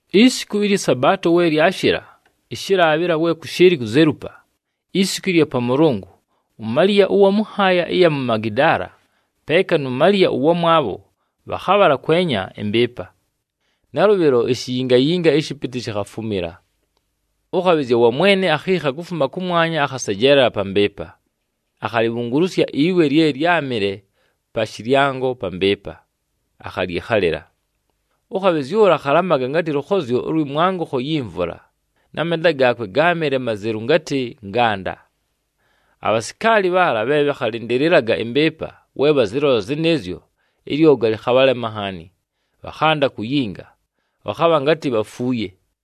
Isiku ɨlyɨ Sabaato we lyashɨla, ɨshɨlaabhɨla we kʉshɨɨlɨ kuzelupa, isiku ɨlya Pamʉlʉngʉ, uMaliya ʉwa mʉ nhaaya ɨya mu Magidaala peeka nu Maliya ʉwamwabho, bhakhabhala kwenya ɨmbɨɨpa. Nalʉbhɨlo ishiyingayinga ɨshɨpɨtɨ shikhafumila. Ʉkhabhɨzya wa Mwene akhiikha kufuma kʉmwanya, akhasejeelela pa mbɨɨpa, akhalibhungulusya iwe lye lyámɨle pa shɨlyango pa mbɨɨpa, akhalyɨkhalɨla. Ʉkhabhɨzya ʉla akhalamaga ngatɨ lʉkhozyo ʉlwɨ mwangʉkho yi mvula na menda gaakwe gáamɨle mazelu ngatɨ nganda. Abhasikaali bhaala bhe bhakhalɨndɨlɨlaga ɨmbɨɨpa, we bhazɨlola zɨnɨɨzyo, ɨlyoga lɨkhabhalema nhaani, bhakhanda kuyinga, bhakhabha ngatɨ bhafuuye.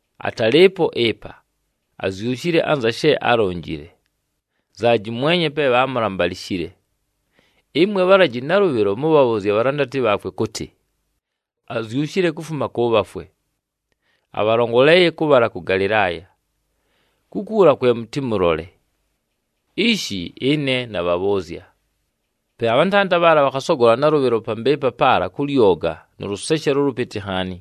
Atalɨɨpo ɨpa, azyushile anza she álonjile. Nzaaji mwenye pe bhaamulambalishile. Ɨmwe bhalaji nalʉbhɨlo mʉbhabhʉʉzye abhalandati bhaakwe kʉtɨ, ‘Azyushile kufuma kʉ bhafwe, abhalongoleeye kʉbhala kʉ Galɨlaaya. Kukuula kwe mʉtɨmʉlole.’ Ishi ɨne nabhabhʉʉzya!” Pe abhantanda bhaala bhakhasogola nalʉbhɨlo pa mbɨɨpa paala kʉ lyoga nʉ lʉseshelo ʉlʉpɨtɨ nhaani.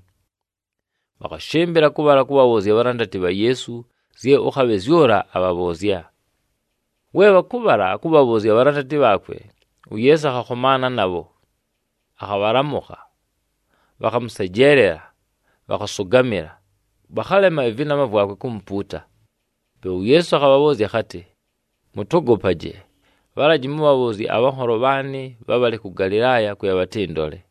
Bhakhashɨmbɨla kʉbhala kʉbhabhʉʉzya abhalandati bha Yeesu zye ʉkhabhɨzya ʉla akhabhabhʉʉzya. We bhakʉbhala kʉbhabhʉʉzya abhalandati bhaakwe, uYeesu akhakhomaana nabho, akhabhalamʉkha. Bhakhamʉsejeelela, bhakhasʉgamɨla, bhakhalema ɨvɨnama vwakwe kumupuuta. Pe uYeesu akhabhabhʉʉzya akhatɨ, “Mʉtogopaje, bhalaji mʉbhabhʉʉzye abhanholo bhaanɨ bhabhale kʉ Galɨlaaya kwe bhatɨndole.”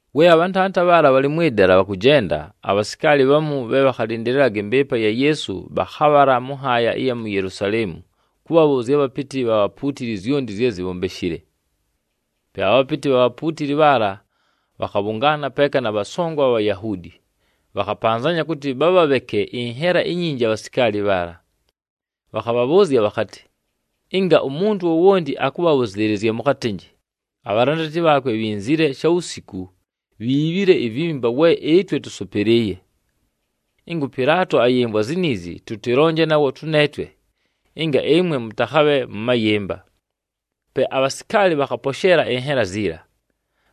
We abhantanda bhaala bhalɨ mwɨ dala bhakʉjenda, abhasikaali bhamu bhe bhakhalɨndɨlɨlaga ɨmbɨɨpa ya Yeesu bhakhabhala mʉ nhaaya ɨya mu Yelusaleemu kʉbhabhʉʉzya abhapɨtɨ bha bhapuutili zyonti zye zibhombeshile. Pe abhapɨtɨ bha bhapuutili bhaala bhakhabhʉngaana peeka na bhasongo abha Bhayahuudi, bhakhapanzanya kʉtɨ bhabhabheke ɨnhela inyinji abhasikaali bhaala. Bhakhabhabhʉʉzya bhakhatɨ, “Ɨnga umuntu wowonti akʉbhabhʉzɨɨlɨzya, mʉkhatɨnjɨ, ‘Abhalandati bha Yeesu bhinzile shawusiku bhiibhile ivimba, we ɨtwe tʉsʉpɨlɨɨye.’ Ɨnga ʉPɨlaato ayɨmvwa ziniizi, tʉtɨlonje nawo tʉneetwe, ɨnga ɨmwe mʉtakhabhe mʉ mayɨmba.” Pe abhasikaali bhakhaposheela ɨnhela ziila,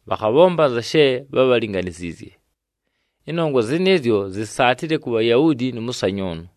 bhakhabhomba anza she bhábhalinganiziizye. Ɨnongwa zɨnɨɨzyo zisaatile ku Bhayahuudi, nʉ mʉsanyʉʉnʉ.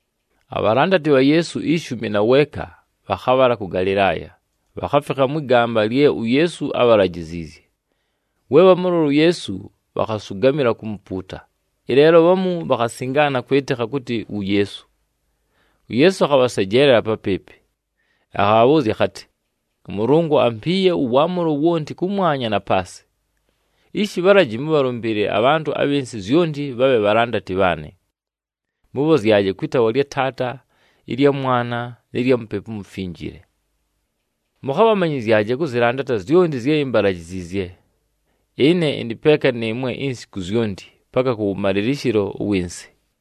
Abhalandati bha Yeesu ishumi na weeka bhakhabhala kʉ Galɨlaaya, bhakhafikha mwɨ gamba lye uYeesu ábhalajiziizye. We bhamʉlola uYeesu, bhakhasʉgamɨla kumupuuta, ɨleelo bhamu bhakhasingaana kwɨtɨkha kʉtɨ wu Yeesu. UYeesu akhabhasejeelela papɨɨpɨ, akhabhabhʉʉzya akhatɨ, “ɄMʉlʉngʉ ampiiye ʉwaamʉlo wonti kʉmwanya na paasɨ. Ishi bhalaji mʉbhalʉmbɨɨlɨle abhantʉ abhɨ nsɨ zyonti bhabhe bhalandati bhaanɨ, mʉbhozyaje kwɨ taawa lya Taata, ɨlya Mwana nɨ lya Mupepu uMufinjile. Mʉkhabhamanyɨzyaje kʉzɨlandata zyonti zye imbalajiziizye. Ɨne ɨndɨ peeka nɨɨmwe insiku zyonti, paka kʉwʉmalɨlɨshɨlo ʉwɨ nsɨ.”